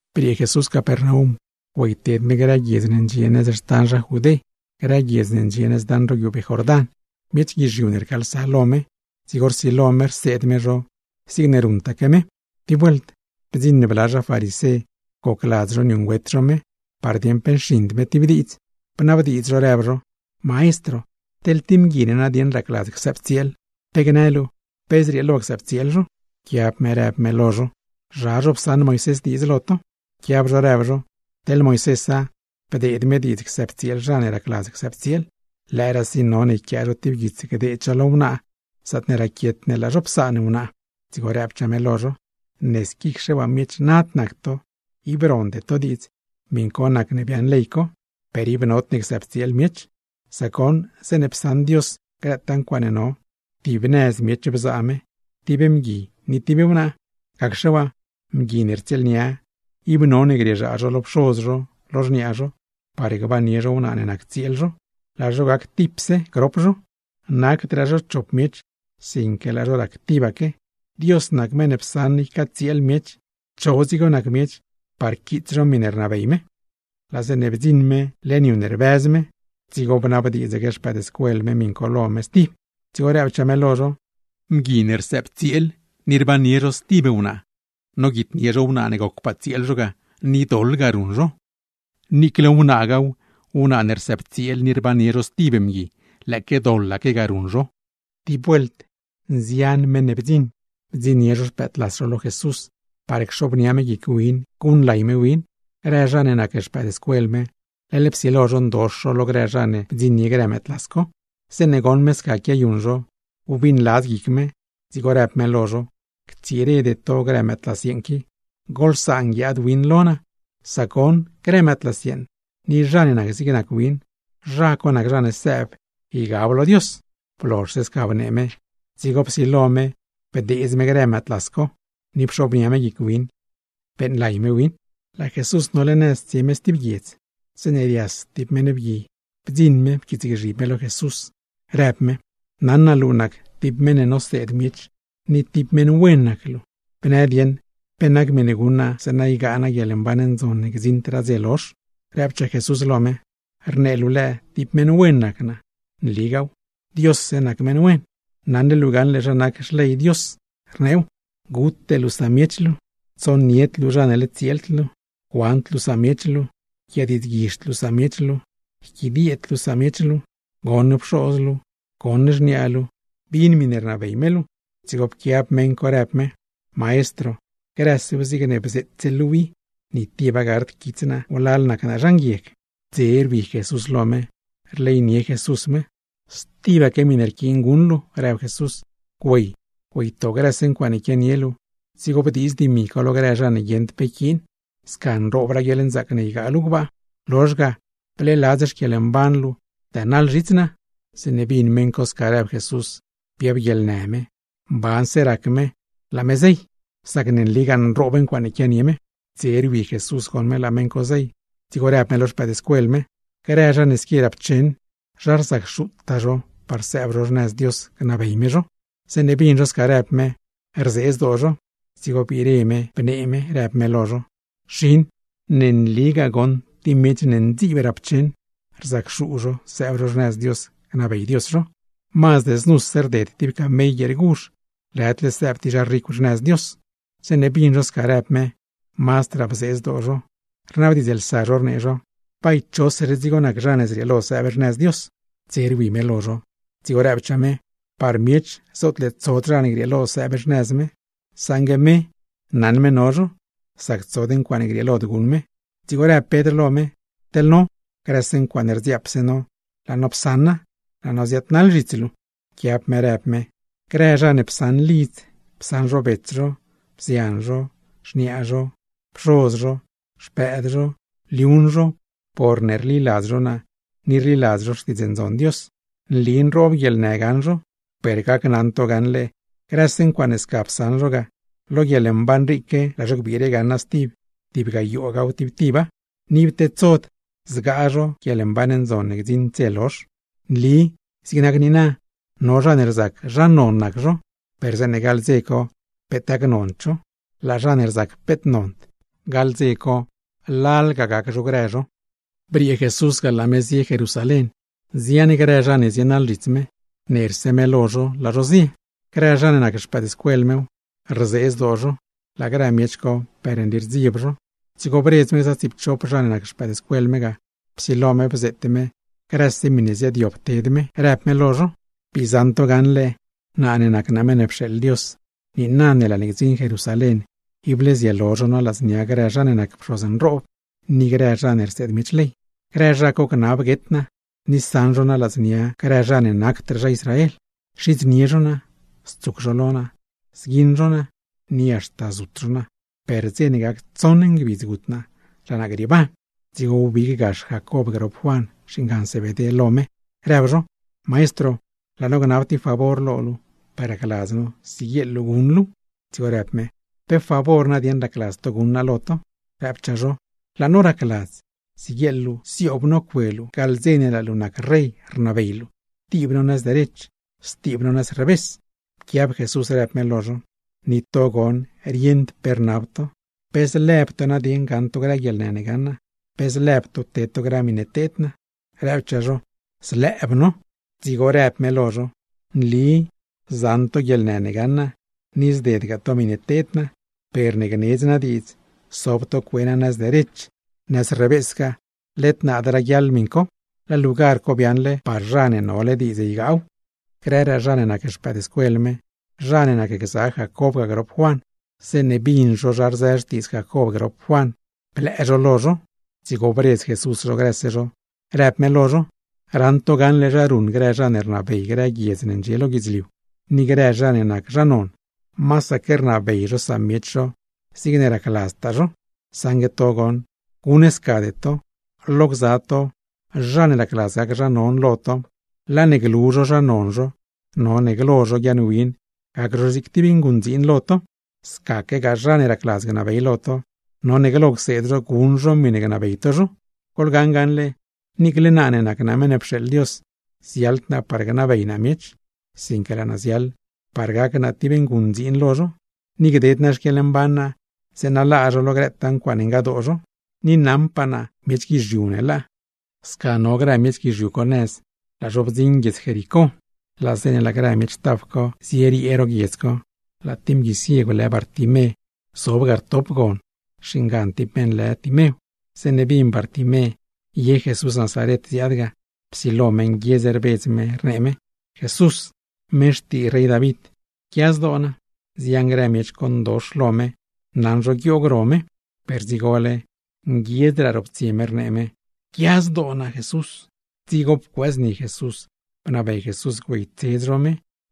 Briee Jesús Capernaum güeyted me grë guiedz ne ndxie nëz xtan zha Judé, grë guiedz ne ndxie nëz daṉ ro guiubee Jordán. Miech guizhiu ne rcaalsa lo me, dzigo rsilo me rseed me zho zigne ruṉtaque me. Tib vuelt bdziṉ bla zha farisé gocladz zho niuṉgüet zho me, par dieṉ pe nxiṉd me tib diidz; bnabdiidz zho rëb zho: ―Maestro, mgui ne racladz csëbtsieel, ¿pe gnë luu pe zrieelo csëbtsieel zho? Pquiab me rëb me lo zho: ―¿Zha zho psaṉ Moisés diidz lo to? Pquiab zho rëb zho: ―Teḻ Moisésa, bdeed me diidz csëbtsieel zha ne racladz csëbtsieel, lëëraasi none yquia tib guits gdeed zho lo wnaa zaatne raquiet ne laa zho psaan wnaa. Dzigo rëbchaa me lo zho: ―Ne squicxe waa miech nad nac to ib ronde to diidz, miṉ co nacne biaaṉ ley co. Per ib nodne csëbtsieel miech; sac goṉ, zeeṉe psaṉ Dios grëtaa ncuaaṉe no, tib nëz miech bzaa me: tib mgui ni tib wnaa. Gacxe waa, mgui ne rtsieelnia ib none grieezhaa zho lo pxoz zho, lo xniaa zho, par gbannie zho wnaa ne nac tsieel zho; laa zho gactipse grop zho. Nacdraa zho chop miech, sinque laa zho rac tibaque. Dios nac meṉ ne psaṉ ycatsieel miech, cho dzigo nac miech par quiits zho miṉe rnabey me. Laa zeeṉe bdziṉ me leṉ yu ne rbëz zho, dzigo bnabdiidzaque xpëëdscuel me miṉ co lo me stib. Dzigo rëbchaa me lo zho: ―Mgui ne rsëbtsieel ni rbannie zho stib wnaa, noguitnie zho wnaa ne gocpaa tsieel zho ga, ni doḻ ga ruṉ zho. Niicle wnaagaaw, wnaa ne rsëbtsieel ni rbannie zho stib mgui, lëëque doḻaque ga ruṉ zho. Tib vuelt nzian meṉ ne bdziṉ bdziṉnie zho xpëëdlas zho lo Jesús, par cxobnia me guic win guṉlay me win. Grë zha ne nac xpëëdscuel me, leḻ psilo zho ndox zho lo grë zha ne bdziṉnie grë mëëdlas co. Zeeṉe goṉ me sca quiayuṉ zho, wbiṉladz guic me, dzigo rëb me lo zho: ―Ctsirede to grë mëëdlas yeeṉ qui, goḻsaan guiaad win lo naa. Sac goṉ grë mëëdlas yeeṉ, ni zha ne nac zigne nac win, zha co nac zha ne sëëb ygab lo Dios. Blozhse sca bnee me, dzigo psilo me bdeedz grë mëëdlas co, ni pxobnia me guic win beeṉlay me win. Laa Jesús nole nëz tsie me stib guiedz, zeeṉe rias tib niib nguieg bdziṉ pquiitsgzhib lo me, rëb niib lo me: ―Naṉ naa luu nac tib meṉ ne noseed miech, ni tib meṉ wen nac luu; ¿bnë dieṉ pe nac miṉe guṉ naa zeeṉa ygaa naa guieḻmban ndzon ne gdziṉdraa dze lozh? Rëbchaa Jesús lo niib: ―Rnee luu lëë tib meṉ wen nac naa. ¡Nligaaw, Diosse nac meṉ wen! Naṉle luu gaṉle zha nac Xley Dios, rneew: Gute luu samiech luu, teḻne nole tsieel luu, tsonied luu zha ne led tsieeld luu, cuand luu samiech luu, yquiadiidzguizhd luu samiech luu, yquidieed luu samiech luu, goṉ pxoz luu, goṉ xniaa luu; bin miṉe rnabey me luu. Dzigo pquiab niib rëb niib lo me: ―Maestro, grësew zigne bzeetse luuw i, ni tiba gard quits naa wlal ne nac naa zha nguieg. Dze rwi Jesús lo niib, rleynie me niib. ―Stibaque miṉe rquiin guṉ luu ―rëb me―, güey, güeyto grëse ncuaaṉe quianie luu, dzigo bdiiz dimi co lo grë zha mban ne guieṉd pe yquiin; sca nroobraa guieḻnzaac ne ygaa luu gbaa. Lozh ga, bleeladz xquieḻmban luu dënaḻ zhits naa. Zeeṉe bin niib co sca rëb Jesús, biab guieḻnë niib, mbanse rac niib laa niib zey; sac ne nligaa nroob ncuaaṉe quianie niib. Dze rwi me goṉ me laa zha nguieg co zey, dzigo rëb me lo xpëëdscuel me: ―¡Grë zha ne squi rapcheṉ, rzacxuu zho par sëëb zho xnëz Dios gnabey me zho! Zeeṉe bin zho sca rëb me, rzee zdoo zho. Dzigo biire me bnee me rëb me lo zho: ―Xin, ¡ne nligaa tib miech ne ndziib rap cheṉ, rzacxuu zho sëëb zho xnëz Dios gnabey Dios zho! Mazd znuse rded tib camell guieer guzh, lëdle sëëb tib zha ricw xnëz Dios. Zeeṉe bin zho sca rëb me, mazdraa bzee zdoo zho, rnabdiidzlsa zho rnee zho: ―Bay, ¿chose dzigo nac zha ne zrieelo sëëb xnëz Dios? Dze rwi me lo zho, dzigo rëbchaa me: ―Par miech zootle tsod zha ne grieelo sëëb xnëz me. Saṉgue me, naṉ me no zho; sac tsod ncuaaṉe grieelod guṉ me. Dzigo rëb Pedr lo me: ―Teḻ no, grëse ncuaaṉe rdziaap no laa no psaṉa, laa no ziaadnaḻ zhits luu. Pquiab me rëb me: ―Grëse zha ne psaṉ lidz, psaṉ zho bets zho, bzian zho, xniaa zho, pxoz zho, xpëëd zho, liuṉ zho, porne rliladz zho naa ni rliladz zho Xtiidz Ndzon Dios; nli nroob guieḻnë gaṉ zho, per gneli naa lo to gaṉle: grëse ncuaaṉe sca psaṉ zho ga, lo guieḻmban riique laa zho gbiire gaṉa stib tib gayoogaw tib tiba; ni ib tedsod zgaa zho tib guieḻmban ndzon ne gdziṉdraa dze lozh. ’Nli zig nac niina, no zha ne rzac zha non nac zho, per zeeṉe gaḻ dze co peet gacnond zho; laa zha ne rzac zho peet nond, gaḻ dze co lalga gac zho grë zho. Briee Jesús ga laa me zie Jerusalén. Nzian grë zha ne zienaḻ zhits me, nerse me lo zho laa zho zie. Grë zha ne nac xpëëdscuel mew, rzee zdoo zho; laa grëraa miech co per nli rdzieb zho. Dzigo bredz me gza tsiipchop zha ne nac xpëëdscuel me ga, psilo me bzeet me grëse teḻ zha ziaadyob ted me, rëb me lo zho: ―Bii zaṉ to gaṉle, naa ne nac naa Meṉ ne pxeeḻ Dios, niina ne laa ne gdziṉ Jerusalén ible zielo zho naa ladznia grë zha ne nac pxoz nroob ni grë zha ne rseed miech ley. Grë zha co gnab guet naa, ni saṉ zho naa ladznia grë zha ne nacdraa zha Israel. Xidznie zho naa, stsuc zho lo naa, zguiṉ zho naa, ni haxta zut zho naa; per dze ne gac tsoṉ ngbidz gut naa laa naa grieeban. Dzigo wbig gax Jacob grop Juan (xingan Zebedé) lo me, rëb zho: ―Maestro, laa no gnab tib favor lo luu, per racladz no siguieḻ luu guṉ luuw. Dzigo rëb me: ―¿Pe favor ne racladz to guṉ naa lo to? Rëbchaa zho: ―Laa no racladz, siguieḻ luu zioob no cue luu gaḻ dze ne laa luu nac rey rnabey luu, tib no nëz derech stib no nëz revés. Pquiab Jesús, rëb me lo zho: ―¡Ni to goṉ rieṉd pe rnab to! ¿Pe zlëb to gaṉ to grë guieḻnë ne gaṉ naa, pe zlëb to ted to grë miṉe teed naa? Rëbchaa zho: ―¡Zlëëb no! Dzigo rëbchaa me lo zho: ―Nli zaṉ to guieḻnë ne gaṉ naa, ni zded to miṉe teed naa; per ne gnedz naa diidz sob to cue naa nëz derech o nëz revésgaa, led naad raguiaḻ miṉ co; laa lugar co biaaṉle par zha ne nole diidz ygaaw. Grëraa zha ne nac xpëëdscuel me, zha ne nacgza Jacob ga grop Juan, zeeṉe bin zho zha rzë xtiidz Jacob grop Juan blëë zho lo zho. Dzigo bredz Jesús zho grëse zho, rëb me lo zho: ―Raṉ to gaṉle zha ruṉ grë zha ne rnabey grë guiedz ne ndxie lo guidzliu, ni grë zha ne nac zha non, masaque rnabey zho samiech zho zigne racladztaa zho. Saṉgue to goṉ, guṉscade to. Lo gza to, zha ne racladz gac zho zha non lo to, laa ne glu zho zha non zho, none glo zho guiaaṉwin gac zho zig tib nguṉdziin lo to. Scaquegaa, zha ne racladz gnabey lo to, none glo cseed zho guṉ zho miṉe gnabey to zho. Goḻgaṉ gaṉle, niicle naa ne nac naa Meṉ ne pxeeḻ Dios, ziaḻd naa par gnabey naa miech, sinque laa naa ziaḻ par gac naa tib nguṉdziin lo zho, ni gded naa xquieḻmban naa zeeṉa laa zho lo grëtaa ncuaaṉe ngadoo zho. Ni naṉpaa naa miech guizhiu ne laa. Sca no grë miech guizhiu co nëz, laa zho bdziṉ guiedz Jericó. Laa zeeṉe laa grë miech taf co zieriee ro guiedz co, laa tib mgui ciegw lë Bartimé zob ga rtop gon (xingan tib meṉ lë Timew). Zeeṉe bin Bartimé ye Jesús (Nazaren) ziaad ga, psilo me nguiedz rbedz me, rnee me: ―¡Jesús, meṉ xtii rey David, pquia zdoo naa! Nzian grë miech co ndox lo me naṉ zho guioog ro me, per dzigole mazdraa nguiedz roptsie me, rnee me: ―¡Jesús, pquia zdoo naa! Dzigo pcuëëzni Jesús, bnabey Jesús güeytsedz zho me.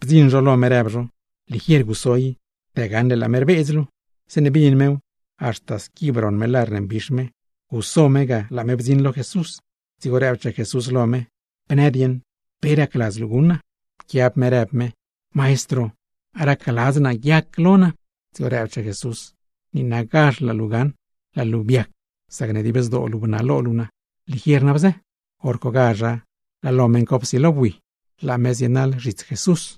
Bdziṉ zho lo me, rëb zho: ―¡Ligier guso i! Dë gaṉle laa me rbedz luu. Zeeṉe bin mew, haxta squi broṉ me lar ne mbix me, guso me ga laa me bdziṉ lo Jesús. Dzigo rëbchaa Jesús lo me: ―Bnë nadieṉ, ¿pe racladz luu guṉ naa? Pquiab me rëb me: ―Maestro, racladz naa guiac lo naa. Dzigo rëbchaa Jesús: ―¡Niinagazh laa lo luu gaṉ! Laa luu biac, sacne dib zdoo luu bnalo luu naa. Ligier na bzë. Horcogazha laa lo meṉ co psilo bui, laa me zienaḻ zhits Jesús.